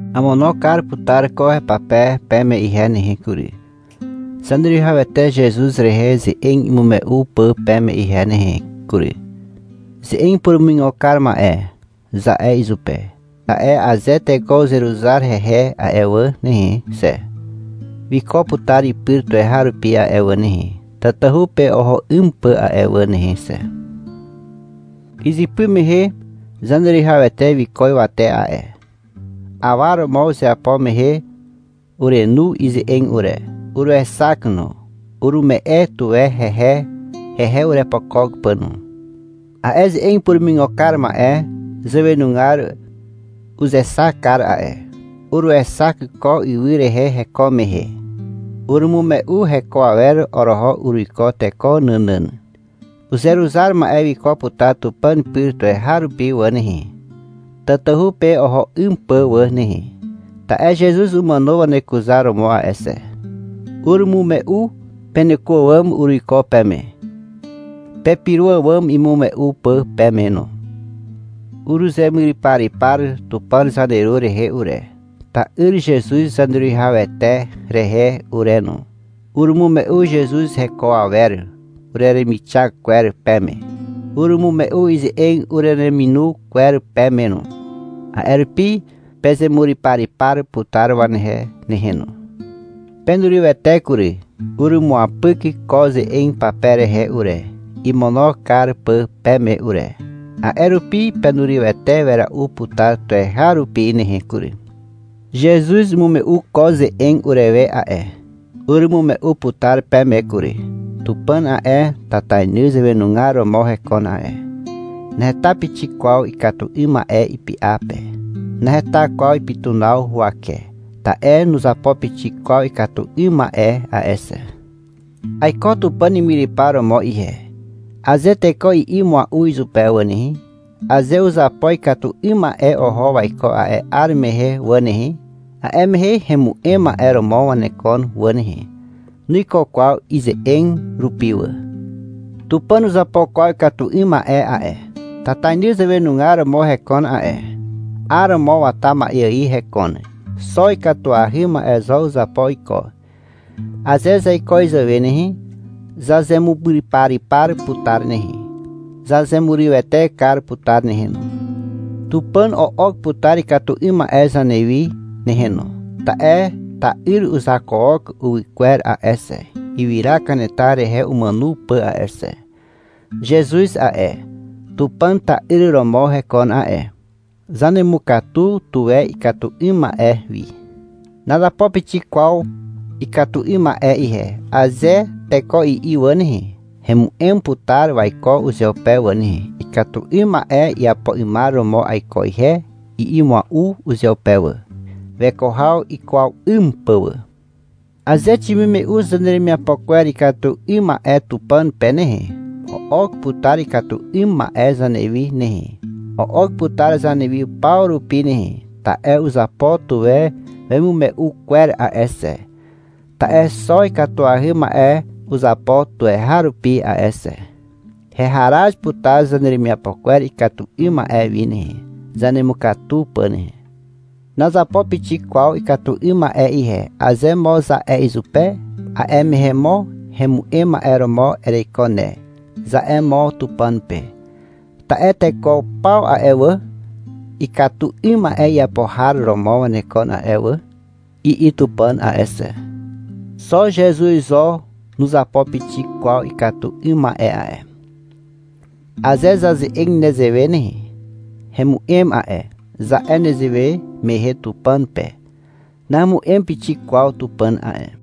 Amono kar putar ko hepape peme ihe nehe kury, Zaneruwihawete Zezuz rehe ze'eg imume'u pà peme ihe nehe kury. — Ze'eg purumuigo kar ma'e, za'e izupe, ta'e aze teko uzeruzar hehe a'e wà nehe xe, wiko putar ipyr tuweharupi a'e wà nehe, tatahu pe oho 'ym pà a'e wà nehe xe. Izypy mehe Zaneruwihawete wiko ywate a'e. Awa romo izeapo mehe urenu ize'eg ure. Uruexak no. Urume'e tuwe hehe, hehe urepokok pà no. A'e ze'eg purumuigo kar ma'e zàwenugar uzexak kar a'e. Uruexak ko ywy rehe heko mehe. Urumume'u heko awer oroho uruiko teko nànàn. Uzeruzar ma'e wiko putar Tupàn pyr tuweharupi wà nehe, tatahu pe oho 'ym pà wà nehe, ta'e Zezuz umàno wanekuzaromo a'e xe. Urumume'u peneko àwàm uruiko peme, pepyro àwàm imume'u pà peme no. Uruzemuryparypar Tupàn zaneru rehe ure, ta'yr Zezuz Zaneruwihawete rehe ure no. Urumume'u Zezuz heko awer ureremixak kwer peme. Urumume'u ize'eg urereminu kwer peme no. A'e rupi pezemuryparypar putar wanehe nehe no. Penurywete kury. Urumuapyk ko ze'eg pape rehe ure, imono kar pà peme ure. A'e rupi penurywete wera'u putar tuweharupi nehe kury. Zezuz umume'u ko ze'eg urewe a'e. Urumume'u putar peme kury. Tupàn a'e, tatainy zàwenugar romo hekon a'e. Naheta pixik kwaw ikatu 'ym ma'e ipy'a pe. — Naheta kwaw ipytunaw huwake. Ta'e nuzapo pixik kwaw ikatu 'ym ma'e a'e xe. — Aiko Tupàn imyrypar romo ihe, aze teko i'i mua'u izupe wà nehe, aze uzapo ikatu 'ym ma'e oho waiko a'e 'ar mehe wà nehe, a'e mehe hemu'em ma'e romo wanekon wà nehe. Nuikuwe kwaw ize'eg rupi wà. Tupàn nuzapo kwaw ikatu 'ym ma'e a'e. Tatainy zàwenugar romo hekon a'e. 'Aromo wata ma'e ài hekon. Xo ikatuahy ma'e zo uzapo iko. Aze zaiko izàwe nehe, zazemuryparypar putar nehe, zazemurywete kar putar nehe no. Tupàn o'ok putar ikatu 'ym ma'e zanewi nehe no, ta'e ta'yr uzakook uwykwer a'e xe, ywyra kanetar rehe umàno pà a'e xe. Zezuz a'e, Tupàn ta'yr romo hekon a'e. Zanemukatu tuwe ikatu 'ym ma'e wi. — Nazapo pixik kwaw ikatu 'ym ma'e ihe, aze teko i'i wà nehe, hemu'em putar waiko uzeupe wà nehe. — Ikatu 'ym ma'e iapo 'ymar romo aiko ihe, i'i mua'u uzeupe wà, weko haw ikwaw 'ym pà wà. Aze ximume'u zaneremiapo kwer ikatu 'ym ma'e Tupàn pe nehe, o'ok putar ikatu 'ym ma'e zanewi nehe. O'ok putar zanewi paw rupi nehe, ta'e uzapo tuwe wemimume'u kwer a'e xe. Ta'e xo ikatuahy ma'e uzapo tuweharupi a'e xe. Heharaz putar zaneremiapo kwer ikatu 'ym ma'e wi nehe, zanemukatu pà nehe. — Nazapo pixik kwaw ikatu 'ym ma'e ihe, aze mo za'e izupe, a'e mehe mo — Hemu'em ma'e romo ereiko ne, za'e mo Tupàn pe. Ta'e — Teko paw a'e wà, ikatu 'ym ma'e iapo har romo wanekon a'e wà, i'i Tupàn a'e xe. (Xo Zezuz zo nuzapo pixik kwaw ikatu 'ym ma'e a'e.) Aze zaze'eg nezewe nehe, — Hemu'em a'e, za'e nezewe mehe Tupàn pe (Nahemu'em pixik kwaw Tupàn a'e).